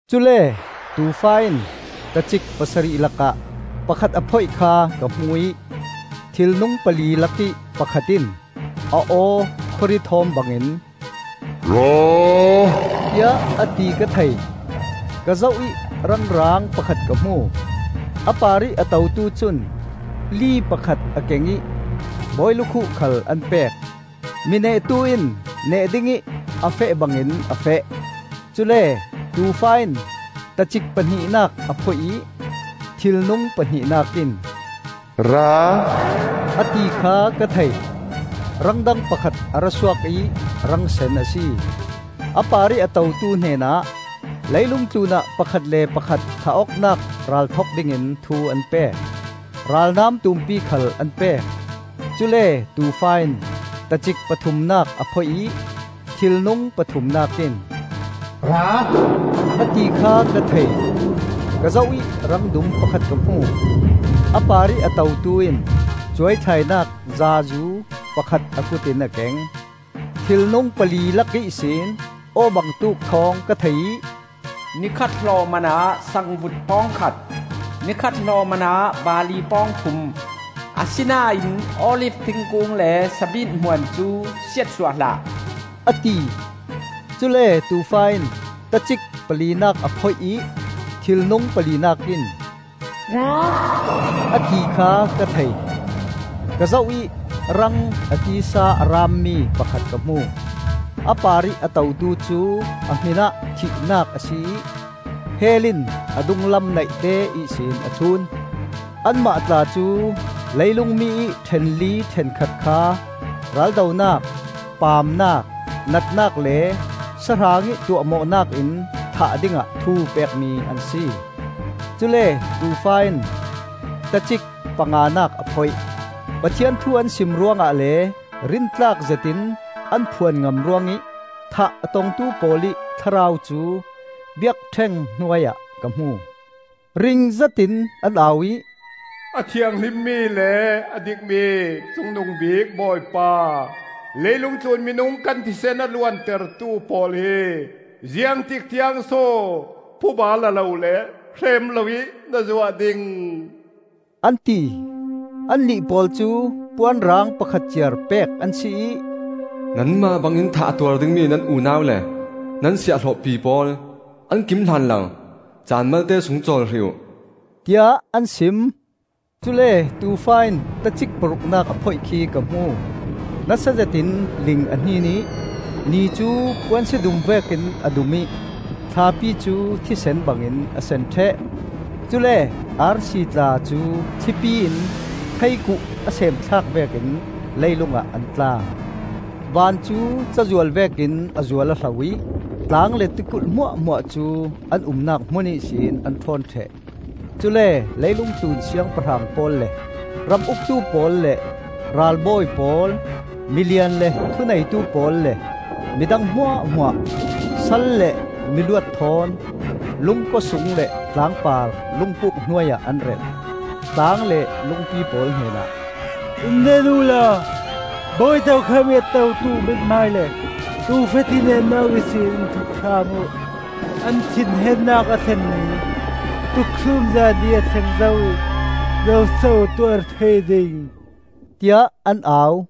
Cule Tuufa in tacik pasarih lakah pakhat a phoih kha ka hmu ih thilnung pali lakih pakhat in, a aw khuari thawm bangin, “Ra,” tiah a ti ka thei. Ka zoh ih rang raang pakhat ka hmu. A parih a totu cun li pakhat a keng ih bawi lukhuh khal an pek. Mi nehtu in neh dingih a feh bangin a feh. Cule Tuufa in tacik pahnihnak a phoih ih thilnung pahnihnak in, “Ra,” a ti kha ka thei. Rang dang pakhat a ra suak ih rang sen a si. A parih a totu hnenah leilung tlunah pakhat le pakhat thah awknak ral thok dingin thu an pek. Ralnam tumpi khal an pek. Cule Tuufa in tacik pathumnak a phoih ih thilnung pathumnak in, “Ra,” a ti kha ka thei. Ka zoh ih rang dum pakhat ka hmu. A parih a totu in cuai thlainak zaazu pakhat a kut in a keng. Thilnung pali lak ihsin aw bangtuk thawng ka thei ih, “Nikhat hlawhman ah sangvut pawng khat, ni khat hlawh manah barli pawng thum. Asinain olif thingkung le sabit hmuan cu siatsuah hlah,” a ti. Cule Tuufa in tacik palinak a phoih ih thilnung palinak in, “Ra,” a ti kha ka thei. Ka zoh ih rang a tisa a raammi pakhat ka hmu. A parih a totu cu a hminah Thihnak a si ih Hell in a dunglam naihte ihsin a thlun. Anmah tla cu leilung mi ih ṭhenli ṭhenkhat kha raldonak, paamnak, natnak le sahrang ih tuahmawhnak in thah dingah thu pekmi an si. Cule Tuufa in tacik panganak a phoih. Pathian thu an sim ruangah le rintlak zetin an phuan ngam ruangih thah a tongtu pawl ih thlarau cu biakṭheng hnuai ah ka hmu. Ring zetin an au ih, “A thianghlimmi le a dikmi Cungnungbik Bawipa, leilung tlun minung kan thisen a luantertu pawl hi ziangtik tiangso phuba la lo le hrem loin na zuah ding?” an ti. Annih pawl cu puan rang pakhat ciar pek an si ih, “Nanmah bangin thah a tuar dingmi nan unau le nan siahhlawhpi pawl an kim hlan lo caan malte sung cawl hrih uh,” tiah an sim. Cule Tuufa in tacik paruknak a phoih khi ka hmu. Nasa zetin ling a hnin ih ni cu puansia dum vekin a dum ih thlapi cu thisen bangin a sen ṭheh. Cule arsi tla cu thlipi in theikuh a sem thlak vekin leilung ah an tla. Van cu cazual vekin a zual aw hlo ih tlang le tikulh hmuahhmuah cu an umnak hmun ihsin an ṭhawn ṭheh. Cule leilung tlun siangpahrang pawl le ram uktu pawl le ralbawi pawl, milian le thuneitu pawl le midang hmuahhmuah, sal le miluat thawn, lungkua sung le tlangpar lungpuk hnuai ah an relh. Tlang le lungpi pawl hnenah, “In nen uhla bawi tokham ih a totu mithmai le Tuufa thinhengnak ihsin in thup hram uh. An thinhengnak a thlen ni, tuksumza ni a thleng zo ih zoso a tuar thei ding?” tiah an au.